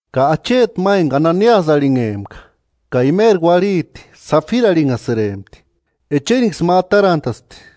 Ka acheti ma enka Ananiasï arhinhempka ka imeri uarhiti Safira arhinhasïrempti, echeriksï ma atarant'aspti,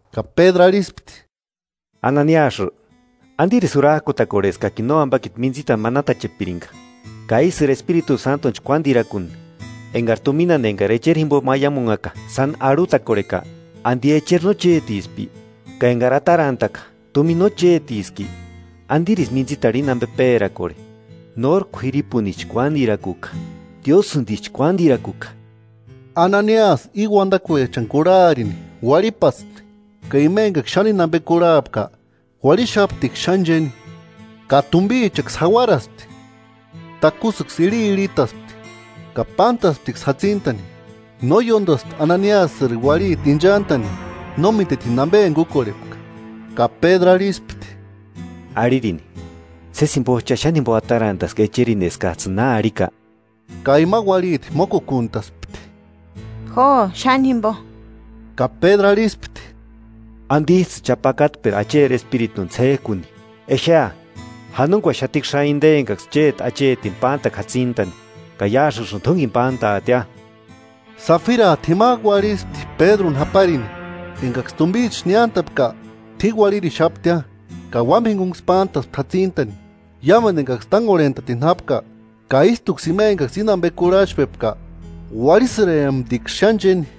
Ka Pédru arhispti: –Ananiasï, ¿Antirisï jurak'utakorhe eskakini nóampakiti mintsitani manatachepirinka, ka ísïri Espiritu Sántuni chkuántirakuni enkari tuminani enkari echeri jimpo maiamunhaka sáni arhutakorheka? ¿Anti echeri no chétispki? Ka enkari atarantaka, ¿Tumina no chétiski? ¿Antirisï mintsitarhu íni ampe pérakorhe? ¡Nóri k'uiripunisï chkuántirakuka, Diósïntisï chkuántirakuka! Ananiasï íni uantakuechani kurharini uarhipaspti. Ka ima enkaksï xáni íni ampe kurhapka uárhixaptiksï xáni chéni. Ka tumpichaksï jauaraspti, takusïksï irhiirhitaspti ka pántasptiksï jatsintani. No ióntaspti Ananiasïri uarhiti inchant'ani no mítetini ampe enka úkorhepka. Ka Pédru arhispti: –Arhirini, ¿Sési jimpots'ï cha xáni jimpo atarantaski echerini eskats'ïni na arhika? Ka ima uarhiti mókukuntaspti: –Jo, xáni jimpo. Ka Pédru arhispti: –¿Antits'ïsï cha pákatpera Acheri Espirituni ts'ék'u? Exea, janunkuaxatiksïa inte enkaksï chéti achetini pántaka jatsintani ka iásïksïni t'únkeni pántaatia. Safirat'u jimak'u uarhispti Pédruni japarini. Enkaksï tumpicha niántapka t'uini uarhirixaptia, ka uámpa jinkunksï pántaspti játsintani. Iámentu enkaksï tánkorhent'atini jápka, ka ístuksï ima enkaksï íni ampe kurhach'pepka uárhisïremptiksï xáni chéni.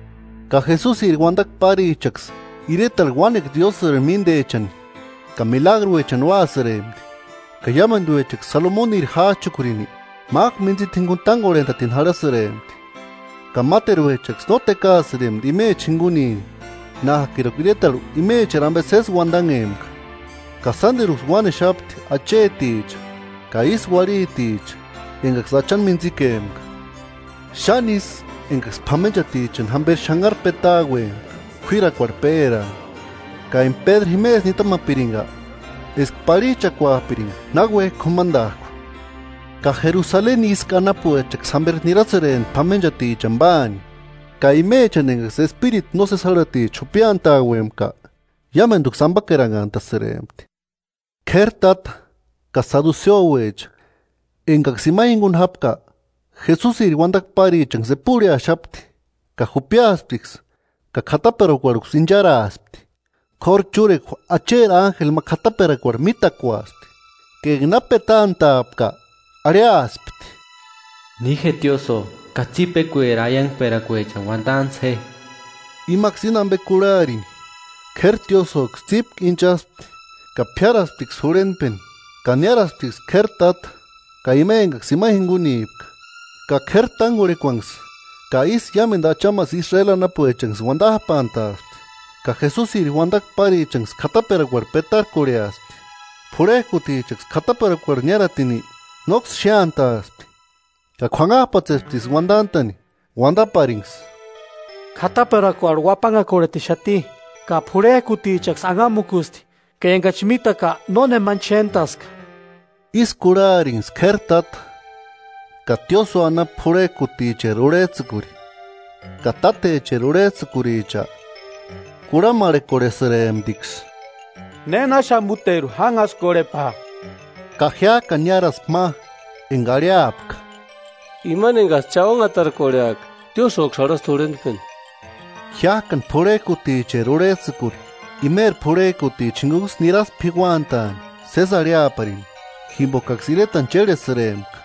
Ka Jesusiri uantakua párichaksï iretarhu uánekua Diósïri míntechani ka milagruechani úasïrempti. Ka iámentuechaksï Salomuniri jách'ukurini mák'u mintsita jinkuni tánkorhent'atini jarhasïrempti. Ka máteruechaksï no tékaasïrempti imecha jinkunini nák'iruka iretarhu imecheri ampe sési ampe uantanhempka. Ka sánteruksï uánexapti acheticha ka ístu uarhiticha enkaksï Achani mintsikempka. Xáni ísï enkaksï p'amenchatichani jámperi xánharu pétauauempka k'uirakuarhu péraani, ka enka Pédru jimesï nitamapirinka eska parhich'akuapirinka náuek'i k'umantak'u. Ka Jerusaleni ísku anapuechaksï jamperi nirasïrempti p'amenchatichani páani, ka imechani enkaksï espiritu nósesi járhaticha jupiantauempka, iámentuksï ampakeranhantasïrempti. K'éri táta ka saduseuecha enkaksï ima jinkuni jápka, Jesusiri uantakua párichanksï epurheaxapti, ka jupiasptiksï ka k'ataperakuarhuksï incharaaspti. K'óru chúrekua Acheri ánjeli ma k'ataperakuarhu mítakuaspti, ka enka na petant'a'apka arhiaspti: “Ni je tiósïo ka tsípikueri aiankperakuechani uantantsï je.” Imaksï íni ampe kurhaarini, k'éri tiósïoksï tsípku inchaspti ka p'íarasptiksï jurhentpeni. Ka niárasptiksï k'éri táta ka ima enkaksï ima jinkunipka, ka k'éri tánkorhekuanksï ka ístu iámentu achamasï Israeli anapuechanksï uantap'antaaspti, ka Jesusiri uantakua párichanksï k'ataperakuarhu petarkorheaspti. P'urhek'utichaksï k'ataperakuarhu niáratini nóksï xéantaaspti, ka k'uanhap'atsesptiksï uantant'a'ni uantaparinksï: –K'ataperakuarhu uapanhakorhetixati ka p'urhek'utichaksï anhamukusti, ka enkachi mítaka nónemanchi xéntaska. Ísï kurharinksï k'éri táta ka tiósïo anapu p'urhek'uticheri urhets'ïkuri ka tátecheri urhets'ïkuricha, kurhamarhekorhesïremptiksï: ¿Nénaxamuteru jánhaskorhepaa? Ka jiák'ani niáraspti ma enka arhiapka: –Imani enkats'ï cha ónhatarkorheaka, tiósïoksï jarhasti jurhentpeni. Jiák'ani p'urhek'uticheri urhets'ïkuri imeri p'urhek'utichani jinkunksï niraspti p'iuantaani sési arhiaparini, jimpokaksï iretani chérhesïrempka,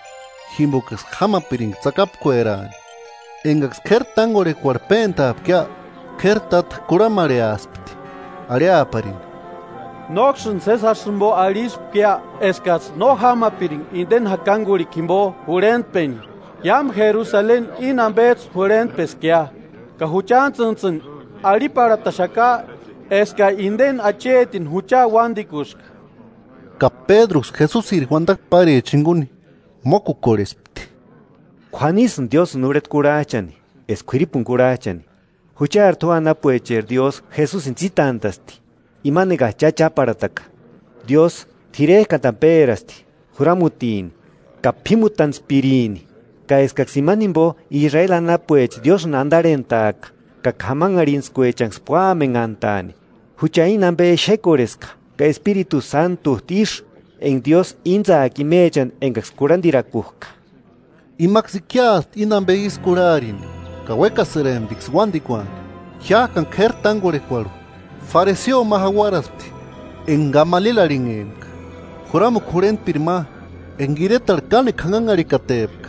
jimpokaksï jámapirinka tsakapkueraani. Enkaksï k'éri tánkorhekuarhu péntaapkia, k'éri táta kurhamarheaspti arhiaparini: –¿Nóksïni sési jásï jimpo arhispkia eskats'ï no jámapirinka inteni jakankurhikua jimpo jurhentpeni? Iámu Jerusaleni íni ampets'ï jurhentpeskia, ka juchantsïntsïni arhiparhataxaka eskani inte achetini jucha uántikuska. Ka Pédruksï Jesusiri uantakua párichani jinkuni mókukorhespti: –K'uanisïnti Diósïni urheta kurhach'ani, eska k'uiripuni kurhach'ani. Juchari tua anapuecheri Diósï Jesusini tsítant'a'sti, imani enkats'ï cha cháparhataka, Diósï t'irek'antani pérasti juramutini ka p'imutantspirini, ka eskaksï imani jimpo Israeli anapuecha Diósïni antarhentaaka ka k'amanharhintskuechanksï púamenhantani. Jucha íni ampe exekorheska, ka Espiritu Sántut'u ísï, enka Diósï íntsaaka imechani enkaksï kurhantirakuk'a. Imaksï ikiaspti íni ampe ísï kurharini, ka uékasïremptiksï uántikuani. Jiák'ani k'éri tánkorhekuarhu, fariseo ma jauaraspti enka Gamalieli arhinhempka, juramukua jurhentpiri ma, enka iretarhu kánekua janhanharhikatepka.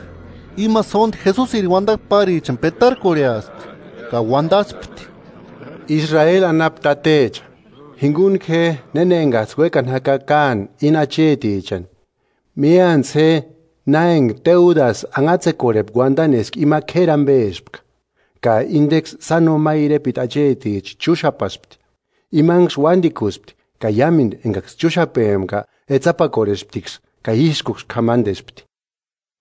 Ima sónti Jesusiri uantakua párichani petarkorheaspti, ka uantaspti: –Israeli anapu tatecha, jinkuntku je néna enkats'ï uékani jaka káani íni achetichani. Míantsï je na enka Teudasï anhatsekorhepka uantani eska ima k'éri ampespka. Ka intenksï sáno ma irepeta acheticha chúxapaspti. Imanksï uántikusti ka iámentu enkaksï chúxapempka etsapakorhesptiksï ka ískuksï k'amantespti.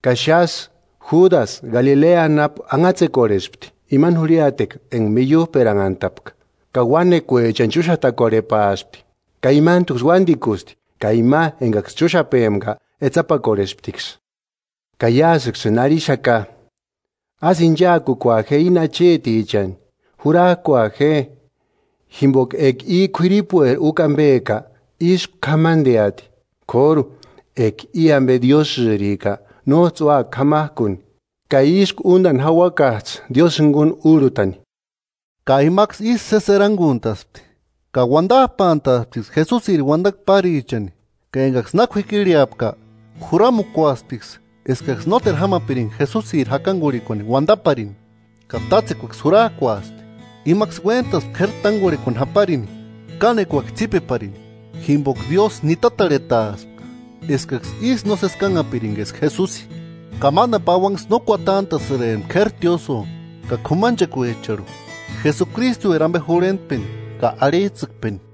Ka xásï Júdasï Galilea anapu anhatsekorhespti, imani jurhiatekua enka miiup'eranhantapka, ka uánekuechani chúxatakorhepaaspti ka imantuksï uántikusti, ka ima enkaksï chúxapempka etsapakorhesptiksï. Ka iásïksïsïni arhixaka: Ásï inchakukua je íni achetichani, jurak'ua je, jimpoka eka i k'uiripueri úkua ampeka, ísku k'amanteati, k'óru enka i ampe Diósïrika, nóts'ï úaka k'amak'uni. Ka ísku úntani jauakats'ï Diósï jinkuni úrhutani. Ka imaksï ísï sési erankuntaspti. Ka uantap'antaasptiksï Jesusiri uantakua párichani ka enkaksï na k'uikirheapka, juramukuasptiksï eskaksï nóteru jámapirinka Jesusiri jakankurhikuani uantaparini, ka tátsekuaksï jurak'uaspti. Imaksï uéntaspti k'éri tánkorhekuani japarini, kánekuaksï tsípeparini, jimpoka Diósï nitatarhetaaspka eskaksï ísï nósesi kánhapirinka eska Jesusi. Ka mántani pauanksï no kuantant'a'sïrempti k'éri tiósïo ka k'umanchekuecharhu Jesukritueri ampe jurhentpeni ka arhits'ïkpeni.